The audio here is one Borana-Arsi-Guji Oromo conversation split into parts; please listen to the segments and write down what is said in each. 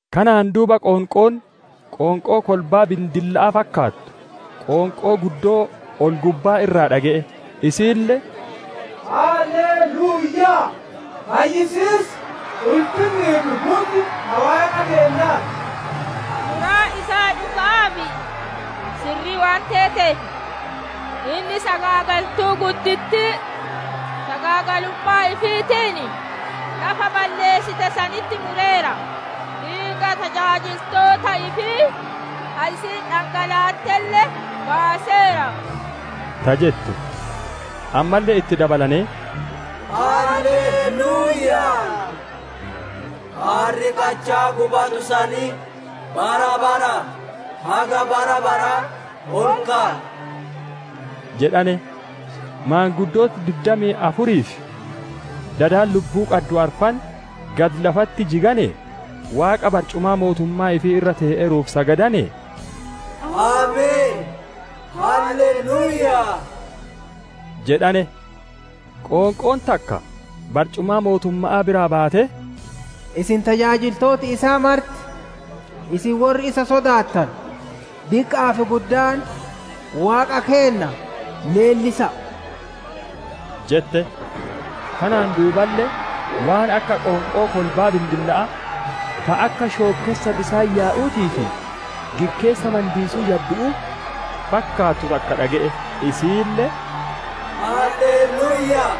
Kanaan duuba qoonqoo, qoonqoo kolbaa bindilla'aa fakkaattu, qoonqoo guddoo ol-gubbaa irraa dhage'e; isiille, «Halle luuyyaa! Fayyisiis, ulfinnii fi hunni ta Waaqa keennaa ti! Muraan isaa dhuga'aa fi sirrii waan teeteef, inni sagaagaltuu guddittii sagaagalummaa ifiitiin lafa balleessite sanitti mureera; dhiiga tajaajiltoota ifii ta isiin dhangalaattelle baaseera» ta jettu. Ammalle itti dabalanee, «Halle luuyyaa! Aarri qachaa gubatu sanii, bara baraa haga bara baraa ol ka'a» jedhane. Maanguddooti diddamii afurii fi dadi lubbuu qaddu arfan gadi lafatti jiganee, Waaqa barcumaa mootummaa ifii irra tee'eeruuf sagadanee, «Ameen, halle luuyyaa!» jedhane. Qoonqoon takka barcumaa mootumma'aa biraa baatee, «Isin tajaajiltooti isaa marti, isin worri isa sodaattanu, diqqa'aa fi guddaan, Waaqa keenna leellisa'a!» jette. Kanaan duuballe waan akka qoonqoo kolbaa bindilla'aa, ta akka shookkessa bisaan yaa'uutii fi gikkeessa mandiisuu jaddu'uu fakkaattu takka dhage'e, isiille, «Halle luuyyaa!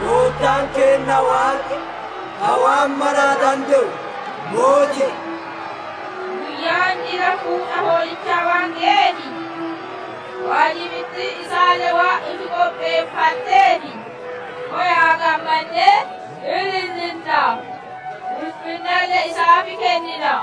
Goottaan keenna Waaqi, ka waan mara dande'u mooti'i. Guyyaan jila fuudha Hoolichaa waan geyee fi waajibittiin isaalle waan ifi qopheeffatteef, kowa'a gammannee ilillinnaa! Ulfinnalle isaaf kennina!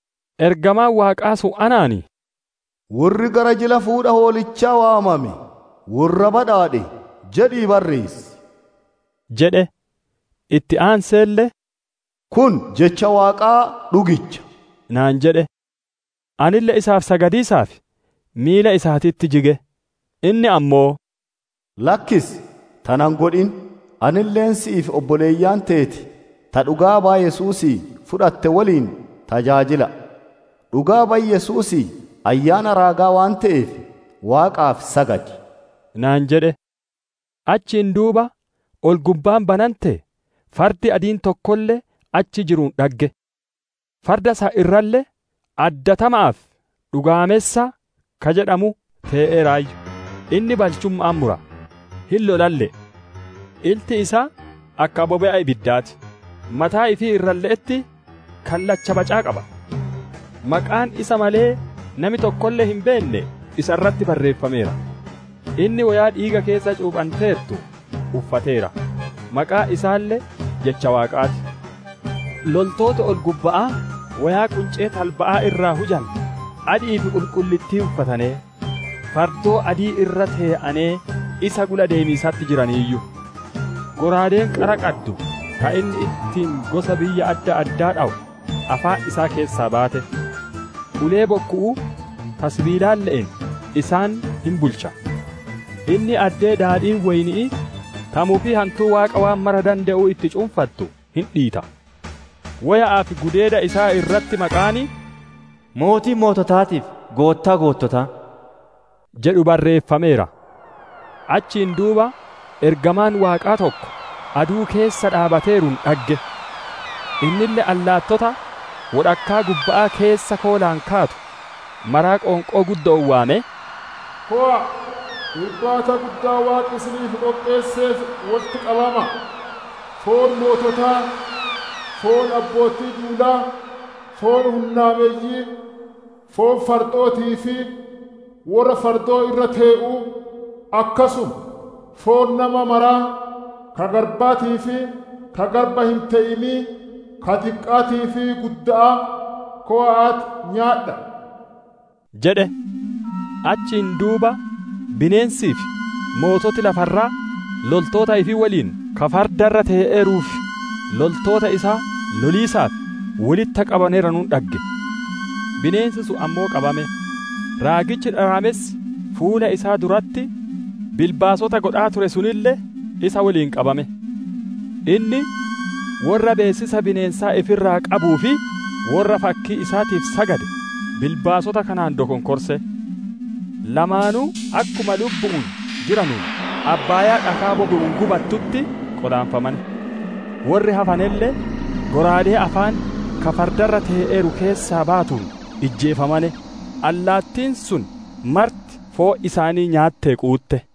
Ergamaan Waaqaa sun anaan, « ‹Worri gara jila fuudha Hoolichaa waamame worra badhaadhe› jedhii barreessi» jedhe. Itti aanseelle, «Kun jecha Waaqaa dhugicha» naan jedhe. Anille isaaf sagadiisaaf miila isaatitti jige; inni ammoo, «Lakkisi! Tana hin godhin! Anille, si'ii fi obboleeyyan teeti ta dhugaa baya Yesuusii fudhatte woliin tajaajila'a; dhugaa bayi Yesuusii Ayyaana raagaa waan te'eef, Waaqaaf sagadi» naan jedhe. Achiin duuba ol-gubbaan banantee, fardi adiin tokkolle achi jiruun dhagge. Farda san irralle, «Addatama'aa fi dhugaamessa» ka jedhamu tee'eeraayyu; inni balchumma'aan mura, hin lolalle'e. Ilti isaa akka bobe'a ibiddaa ti; mataa ifii irralle'etti kallacha bacaa qaba. Maqaan isa malee nami tokkolle hin beenne isa irratti barreeffameera. Inni woyaa dhiiga keessa cuuphanteertu uffateera; maqaan isaalle Jecha Waaqaa ti. Loltooti ol-gubba'aa woyaa quncee talba'aa irraa hujante adi'ii fi qulqullittii uffatanee, fardoo adaadii irra tetee'anee isa gula deemiisatti jiraniiyyu. Shallaagaan qara qabu ka inni ittiin gosa biyya adda addaa dhowu afaan isaa keessaa baye; ulee bokku'uu ta sibiilaatiille'een isaan hin bulcha. Inni addee daadhiin woyni'ii ta mufii hantuu Waaqa waan mara dande'uu itti cunfantu hin dhiita. Woya'aa fi gudeeda isaa irratti maqaan, «Mootii moototaatii fi Goottaa goottotaa» jedhu barreeffameera. Achiin duuba ergamaan Waaqaa tokko aduu keessa dhaabbateeruun dhagge. Innille allaattota wodhakkaa gubba'aa keessa koolaan kaatu mara qoonqoo guddo'oon waamee, «Kowa'a, irbaata guddaa Waaqi isinii qopheesseef wolitti qabama'a! Foon moototaa, foon abbootii duula, foon hunnaameyyi'ii, foon fardo'ootii fi worra fardoo irra tee'uu, akkasuma foon nama maraa, ka garbaatii fi ka garba hin te'inii, ka diqqa'aatii fi gudda'aa kowa'aatii nyaadha'a!» jedhe. Achiin duuba bineensii fi moototi lafa irraa loltoota ifii woliin, ka farda irra tee'eeruu fi loltoota isaa loliisaaf wolitti qabamaneeranuun dhagge. Bineensi sun ammoo qabame; raagichi dharaamessi fuula isaa duratti bilbaasota godhaa ture sunille isa woliin qabame. Inni, worra beessisa bineensaa ifi irraa qabuu fi worra fakkii isaatiif sagade, bilbaasota kanaan dokonkorse. Lamaanuu, akkuma lubbu'uun jiranuun abbaayaa dhakaa bobe'uun gubattutti qolaanfamane. Worri hafanelle, shallaagaa afaan ka farda irra tee'eeruu keessaa bayuun ijjeefamane; allaattiin sun marti foon isaanii nyaattee quutte.